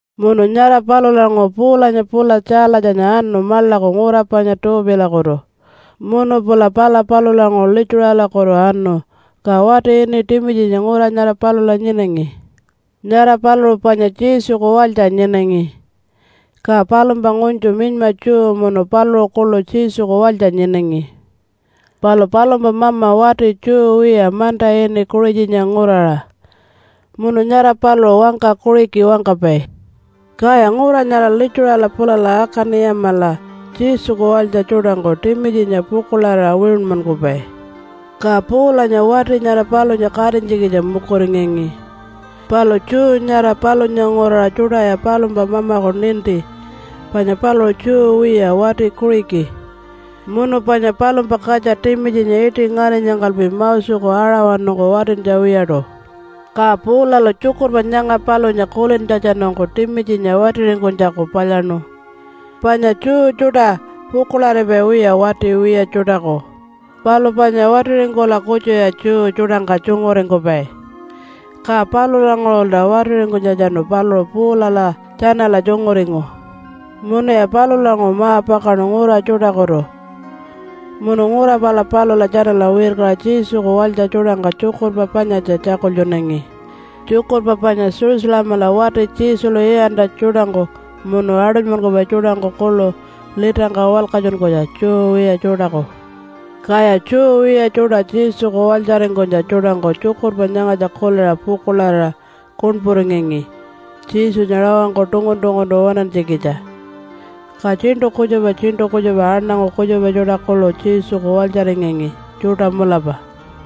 Munu nyara palulanguṟu Paulanya pula Tjaalatjanya anu maḻaku ngura panya Tuupilakutu munu pula pala palulanguṟu Litjuṟalakutu anu. Ka wati ini Timitjinya ngura nyara palula nyinangi. Nyara paluṟu panya Jesuku walytja nyinangi, ka palumpa ngunytju minyma Jew munu paluṟu kuḻu Jesuku walytja nyinangi. Palu palumpa mama wati Jew wiya manta ini Kuṟitjanya nguraṟa munu nyara paluṟu wangka Kuṟiki wangkapai. Kaya ngura nyara Litjuṟala pulala Akani-yamala Jesuku walytja tjuṯangku Timitjinya pukuḻarira wiṟunmankupai. Ka Paulanya wati nyara palunya katinytjikitja mukuringangi, palu Jew nyara palunya nguraṟa tjuṯaya palumpa mamaku ninti panya paluṟu Jew wiya wati Kuṟiki munu panya palumpa katja Timitjinya iṯi ngarinyangkalpi Moseku aṟawanungku watintja wiyaṯu. Ka Paulalu tjukurpa nyanga palunya kulintjatjanungku Timitjinya watiringkunytjaku palyaṉu, panya Jew tjuṯa pukuḻaripai wiya wati wiya tjuṯaku, palu panya watiringkula kutjuya Jew tjuṯangka tjunguringkupai. Ka palulanguṟulta watiringkunytjatjanu paluṟu Paulala tjanala tjunguringu. Munuya palulanguṟu ma-pakaṉu ngura tjuṯakutu munu ngura pala palula tjanala wirkaṟa Jesuku walytja tjuṯangka tjukurpa panyatja tjakultjunangi, tjukurpa panya Jerusalemala wati Jesulu iyantja tjuṯangku munu aṯunymankupai tjuṯangku kuḻu litangka walkatjunkunytja Jew wiya tjuṯaku. Kaya Jew wiya tjuṯa Jesuku walytjaringkunytja tjuṯangku tjukurpa nyangatja kuliṟa pukuḻarira kuṉpuringangi Jesunya rawangku tungun-tunguntu waṉantjikitja, ka tjiṉṯu kutjupa tjiṉṯu kutjupa aṉangu kutjupa tjuṯa kuḻu Jesuku walytjaringangi tjuṯa mulapa.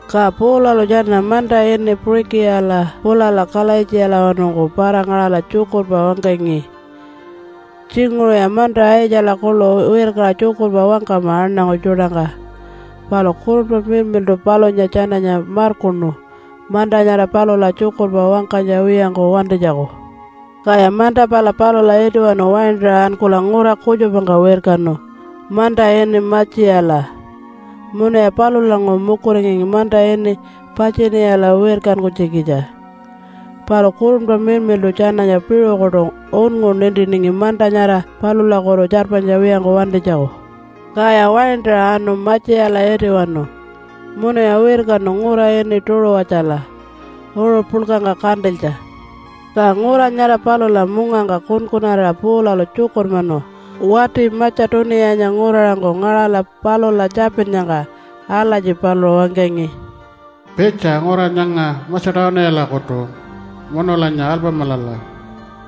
Ka Paulalu tjana manta ini Puṟikiyala pulala Kalaitjiyalawanungku para-ngaṟala tjukurpa wangkangi. Tjinguṟuya manta Aitjala kuḻu wirkaṟa tjukurpa wangkama aṉangu tjuṯangka, palu Kurunpa Miḻmiḻṯu palunya tjananya markuṉu manta nyara palula tjukurpa wangkanytja wiyangku wantinytjaku. Kaya manta pala palula itiwanu waintaṟa ankula ngura kutjupangka wirkanu manta ini Matjiyala munuya palulanguṟu mukuringangi manta ini Patjiniyala wirkankunytjikitja, palu Kurunpa Miḻmiḻṯu tjananya piṟukuṯu unngu nintiningi manta nyara palulakutu tjarpanytja wiyangku wantinytjaku. Kaya waintaṟa anu Matjiyala itiwanu munuya wirkanu ngura ini Tuṟuwatjala uṟu puḻkangka kantilytja. Ka ngura nyara palula mungangka kunkunarira Paulalu tjukurmanu wati Matja-tuniyanya nguraṟangku ngaṟala palula tjapinnyangka. Alatji paluṟu wangkangi, “Pitja ngura nyanga Matja-tuniyalakutu munulanya alpamilala!”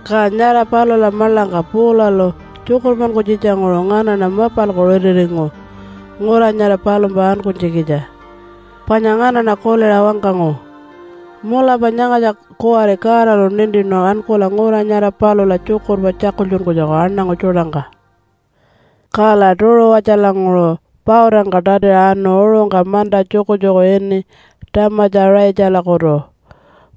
Ka nyara palula maḻangka Paulalu tjukurmankunytjitjanguṟu nganaṉa mapalku ritiringu ngura nyara palumpa ankunytjikitja, panya nganaṉa kuliṟa wangkangu, “Mulapa nyangatja kuwari Godalu nintinu ankula ngura nyara palula tjukurpa tjakultjunkunytjaku aṉangu tjuṯangka.” Kala Tuṟuwatjalanguṟu pautangka tatiṟa anu uṟungka manta tjukutjuku ini Tjamatja-ṟaitjalakutu,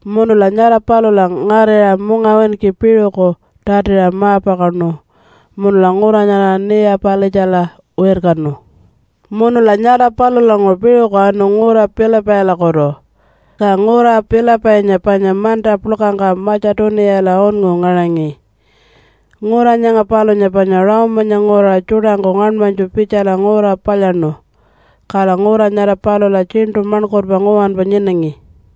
munula nyara palula ngarira mungawinki piṟuku tatiṟa ma-pakaṉu munula ngura nyara Niya-palitjala wirkanu. Munula nyara palulanguṟu piṟuku anu ngura Pilipailakutu. Ka ngura Pilipainya panya manta puḻkangka Matja-tuniyala unngu ngaṟangi. Ngura nyanga palunya panya Rome-anya nguraṟa tjuṯangku ngaṉmanytju pitjala ngura palyaṉu. Kala ngura nyara palula tjiṉṯu maṉkurpa nguwanpa nyinangi.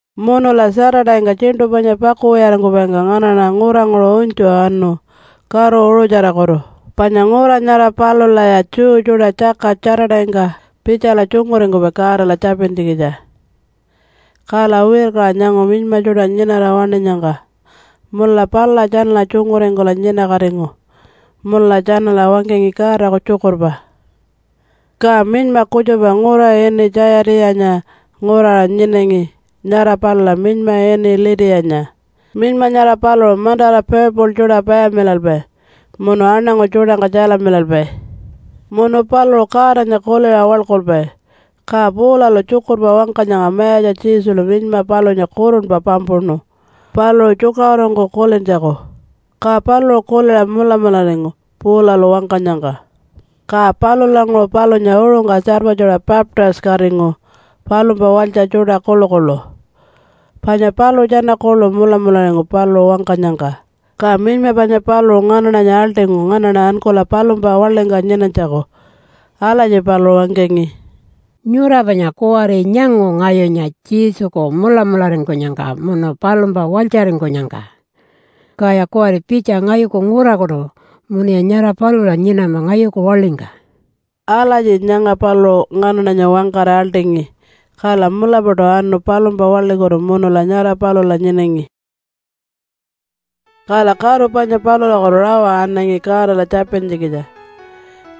Munula Saturday-ngka tjiṉṯu panya pakuwiyaringkupaingka nganaṉa nguranguṟu unytju anu karu uṟutjarakutu panya ngura nyara palulaya Jew tjuṯa tjaka Saturday-ngka pitjala tjunguringkupai Godala tjapintjikitja. Kala wirkaṟa nyangu minyma tjuṯa nyinara waṉinyangka munula palula tjanala tjunguringkula nyinakatingu munula tjanala wangkangi Godaku tjukurpa. Ka minyma kutjupa ngura ini Tjayatiṟanya nguraṟa nyinangi nyara palula minyma ini Litiyanya. Minyma nyara paluṟu mantara purple tjuṯa payamilalpai munu aṉangu tjuṯangka tjalamilalpai. Munu paluṟu Godanya kuliṟa waḻkulpai. Ka Paulalu tjukurpa wangkanyangka Mayatja Jesulu minyma palunya kurunpa pampuṉu paluṟu tjukaṟurungku kulintjaku, ka paluṟu kuliṟa mulamularingu Paulalu wangkanyangka. Ka palulanguṟu palunya uṟungka tjarpatjuṟa baptise-katingu palumpa walytja tjuṯa kuḻukuḻu, panya paluṟu tjana kuḻu mulamularingu paluṟu wangkanyangka. Ka minyma panya paluṟu nganaṉanya aḻṯingu nganaṉa ankula palumpa waḻingka nyinanytjaku. Alatji paluṟu wangkangi, “Nyura panya kuwari nyangu ngayunya Jesuku mulamularingkunyangka munu palumpa walytjaringkunyangka. Kaya kuwari pitja ngayuku ngurakutu munuya nyara palula nyinama ngayuku waḻingka.” Alatji nyanga paluṟu nganaṉanya wangkara aḻṯingi, kala mulapaṯu anu palumpa waḻikutu munula nyara palula nyinangi. Kala karu panya palulakutu rawa anangi Godala tjapintjikitja.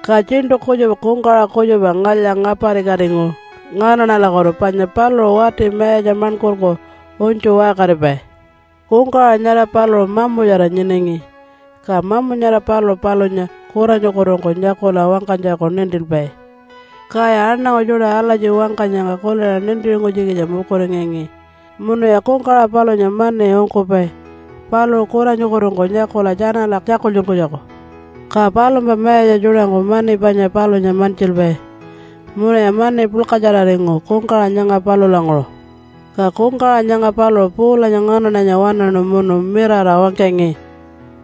Ka tjiṉṯu kutjupa kungkawaṟa kutjupa ngalya-ngaparikatingu nganaṉalakutu panya paluṟu wati mayatja maṉkurku unytju waṟkaripai. Kungkawaṟa nyara paluṟu mamutjara nyinangi, ka mamu nyara paluṟu palunya kuranyukutungku nyakula wangkanytjaku nintilpai. Kaya aṉangu tjuṯa alatji wangkanyangka kuliṟa nintiringkunytjikitja mukuringangi munuya kungkawaṟa palunya mani ungkupai paluṟu kuranyukutungku nyakula tjanala tjakultjunkunytjaku. Ka palumpa mayatja tjuṯangku mani panya palunya mantjilpai. Munuya mani puḻkatjararingu kungkawaṟa nyanga palulanguṟu. Ka kungkawaṟa nyanga paluṟu Paulanya nganaṉanya waṉaṉu munu mirara wangkangi,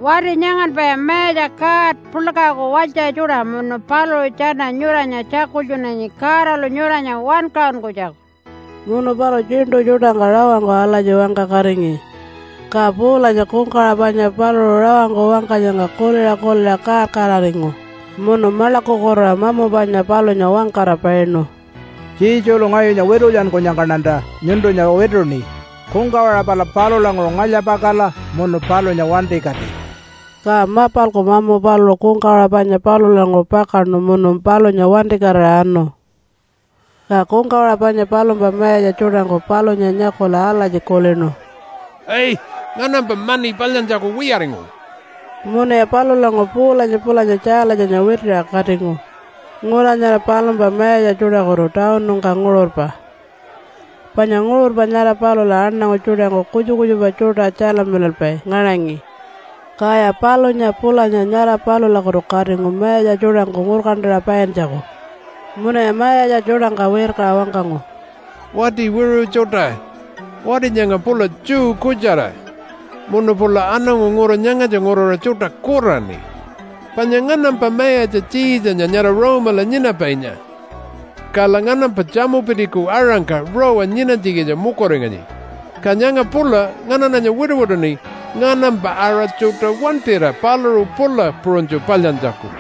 “Wati nyanganpaya Mayatja God Puḻkaku walytja tjuṯa munu paluṟu tjana nyuranya tjakultjunanyi Godalu nyuranya wankaṟunkunytjaku.” Munu paluṟu tjiṉṯu tjuṯangka rawangku alatji wangkakatingi. Ka Paulanya kungkawaṟa panya paluṟu rawangku wangkanyangka kuliṟa kuliṟa kaar-kaararingu munu maḻakukutuṟa mamu panya palunya wangkara painu, “Jesulu ngayunya witulyankunyangkaṉanta nyuntunya wituṉi kungkawaṟa pala palulanguṟu ngalya-pakala munu palunya wantikati!” Ka mapalku mamu paluṟu kungkawaṟa panya palulanguṟu pakaṉu munu palunya wantikatira anu. Ka kungkawaṟa panya palumpa mayatja tjuṯangku palunya nyakula alatji kulinu, “Ai! Nganampa mani palyantjaku wiyaringu.” Munuya palulanguṟu Paulanya pulanya Tjaalatjanya witiṟa katingu ngura nyara palumpa mayatja tjuṯakutu tawunungka nguṟurpa. Panya nguṟurpa nyara palula aṉangu tjuṯangku kutjupa kutjupa tjuṯa tjalamilalpai ngaṟangi, kaya palunya pulanya nyara palulakutu katingu mayatja tjuṯangku ngurkantaṟa paintjaku. Munuya mayatja tjuṯangka wirkaṟa wangkangu, “Wati wiṟu tjuṯa! Wati nyanga pula Jew kutjara munu pula aṉangu ngura nyangatja nguraṟa tjuṯa kuraṉi. Panya nganampa mayatja Tjiitjanya nyara Rome-ala nyinapainya, kala nganampa tjamupitiku aṟangka rawa nyinanytjikitja mukuringanyi. Ka nyanga pula nganaṉanya wituwituṉi nganampa aṟa tjuṯa wantira paluṟu pula puṟunytju palyantjaku.”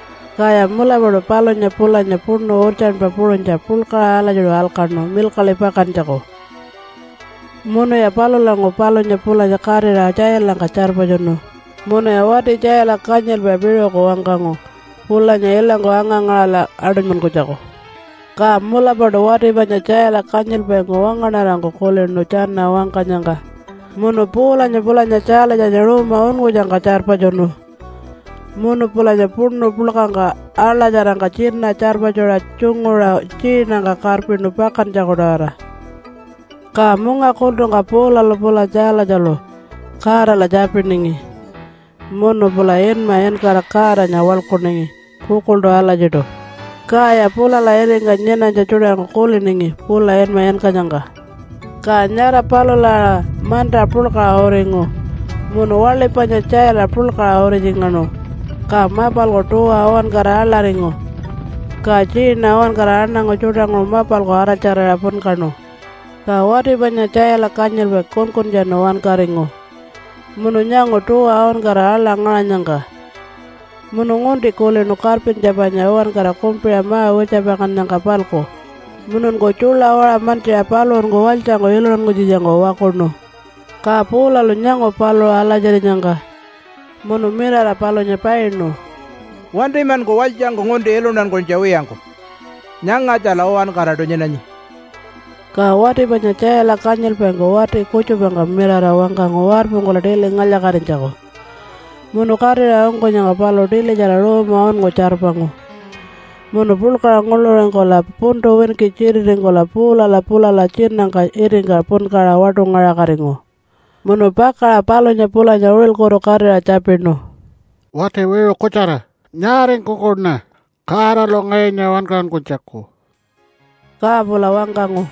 Kaya mulapaṯu palunya pulanya puṉu urtjanpa puṟunytja puḻkaṟa alatjiṯu alkaṉu milkaḻi pakantjaku. Munuya palulanguṟu palunya pulanya katira tjailangka tjarpatjunu munuya wati tjaila kanyilpai piṟuku wangkangu pulanya ilangku anga-ngaṟala aṯunymankunytjaku. Ka mulapaṯu wati panya tjaila kanyilpaingku wangaṉarangku kulinu tjana wangkanyangka munu Paulanya pulanya Tjaalatjanya ruuma unngutjangka tjarpatjunu, munu pulanya puṉu puḻkangka aḻatjarangka tjina tjarpatjuṟa tjunguṟa tjiinangka karpinu pakantjaku-tawara. Ka munga kultungka Paulalu pula Tjaalatjalu Godala tjapiningi munu pula inma inkara Godanya waḻkuningi pukuḻṯu alatjiṯu, kaya pulala itingka nyinanytja tjuṯangku kuliningi pula inma inkanyangka. Ka nyara palula aṟa manta puḻkaṟa uringu munu waḻi panya tjaila puḻkaṟa uritjingaṉu, ka mapalku tuwa uwankara aḻaringu. Ka tjiina uwankara aṉangu tjuṯanguṟu mapalku araltjarira punkaṉu. Ka wati panya tjaila kanyilpai kunkuntjanu wankaringu munu nyangu tuwa uwankara aḻa ngaṟanyangka munu ngunti kulinu karpintja panya uwankara kumpiṟa ma-wirtjapakannyangka-palku mununku tjuḻa waṟa mantjiṟa paluṟunku walytjangku iluntankunytjikitjangku wakuṉu. Ka Paulalu nyangu paluṟu alatjirinyangka, munu mirara palunya painu, “Wantimanku walytjangku ngunti iluntankunytja wiyangku! Nyangatjala uwankaraṯu nyinanyi.” Ka wati panya tjaila kanyilpaingku wati kutjupangka mirara wangkangu warpungkula tili ngalya-katinytjaku. Munu katira ungkunyangka paluṟu tilitjara ruuma unngu tjarpangu munu puḻkaṟa nguḻuringkula puntu winki tjititingkula Paulala pulala tjinangka itingka punkaṟa waṯungaṟakatingu. Munu pakaṟa palunya pulanya uṟilkutu katira tjapinu, “Wati wiṟu kutjara! Nyaaringkukuṉa Godalu ngayunya wankaṟunkunytjaku?” Ka pula wangkangu,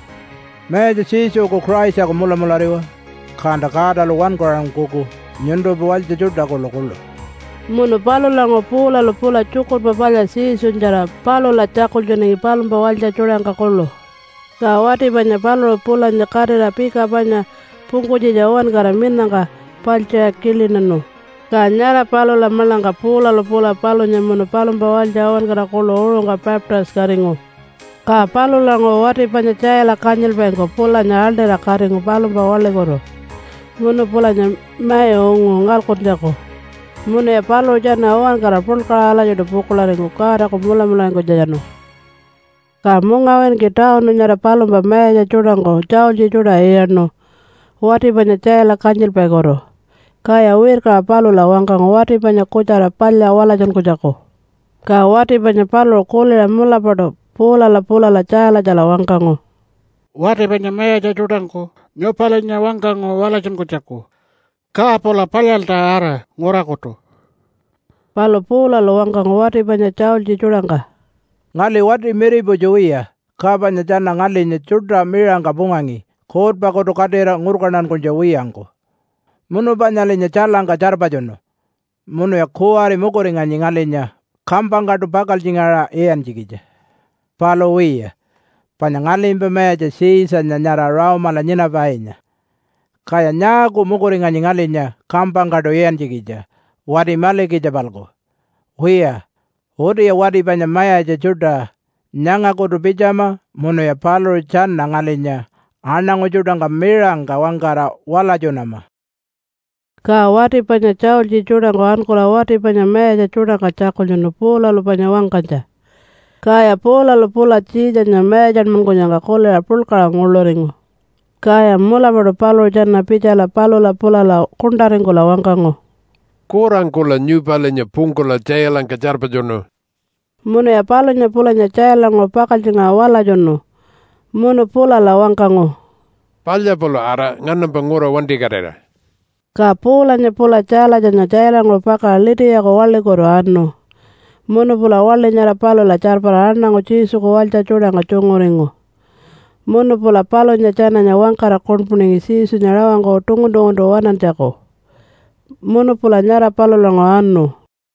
“Mayatja Jesuku Christaku mulamulariwa, kanta Godalu wankaṟunkuku nyuntumpa walytja tjuṯa kuḻukuḻu.” Munu palulanguṟu Paulalu pula Tjukurpa Palya Jesunyatjara palula tjakultjunangi palumpa walytja tjuṯangka kuḻu. Ka wati panya paluṟu pulanya katira pika panya pungkunytjitja uwankara minangka paltjiṟa kilinanu. Ka nyara palula maḻangka Paulalu pula palunya munu palumpa walytja uwankara kuḻu uṟungka baptise-katingu. Ka palulanguṟu wati panya tjaila kanyilpaingku pulanya aḻṯira katingu palumpa waḻikutu munu pulanya mai ungu ngalkuntjaku. Munuya paluṟu tjana uwankara puḻkaṟa alatjiṯu pukuḻaringu Godaku mulamularingkunytjatjanu. Ka mungawinki tawunu nyara palumpa mayatja tjuṯangku tjaultji tjuṯa iyaṉu wati panya tjaila kanyilpaikutu, kaya wirkaṟa palula wangkangu wati panya kutjara palya walatjunkunytjaku. Ka wati panya paluṟu kuliṟa mulapaṯu Paulala pulala Tjaalatjala wangkangu, “Wati panya mayatja tjuṯangku nyupalinya wangkangu walatjunkunytjaku. Ka pula palyalta ara ngurakutu.” Palu Paulalu wangkangu wati panya tjaultji tjuṯangka, “Ngali wati miriputju wiya, ka panya tjana ngalinya tjuṯa miṟangka pungangi kuutpakutu katira ngurkantankunytja wiyangku, munu panyalinya tjailangka tjarpatjunu. Munuya kuwari mukuringanyi ngalinya kampangkaṯu pakaltjingaṟa iyantjikitja. Palu wiya, panya ngalimpa mayatja Tjiitjanya nyara Rome-ala nyinapainya, kaya nyaaku mukuringanyi ngalinya kampangkaṯu iyantjikitja wati malikitja-palku? Wiya, utiya wati panya mayatja tjuṯa nyangakutu pitjama munuya paluṟu tjana ngalinya aṉangu tjuṯangka miṟangka wangkara walatjunama.” Ka wati panya tjaultji tjuṯangku ankula wati panya mayatja tjuṯangka tjakultjunu Paulalu panya wangkanytja. Kaya Paulalu pula Tjiitjanya mayatjanmankunyangka kuliṟa puḻkaṟa nguḻuringu. Kaya mulapaṯu paluṟu tjana pitjala palula pulala kuṉṯaringkula wangkangu, “Kurangkula nyupalinya pungkula tjailangka tjarpatjunu.” Munuya palunya pulanya tjailanguṟu pakaltjingaṟa walatjunu munu pulala wangkangu, “Palya pula ara nganampa ngura wantikatira.” Ka Paulanya pula Tjaalatjanya tjailanguṟu pakaṟa Litiyaku waḻikutu anu, munu pula waḻi nyara palula tjarpara aṉangu Jesuku walytja tjuṯangka tjunguringu munu pula palunya tjananya wangkara kuṉpuningi Jesunya rawangku tungun-tunguntu waṉantjaku. Munu pula nyara palulanguṟu anu.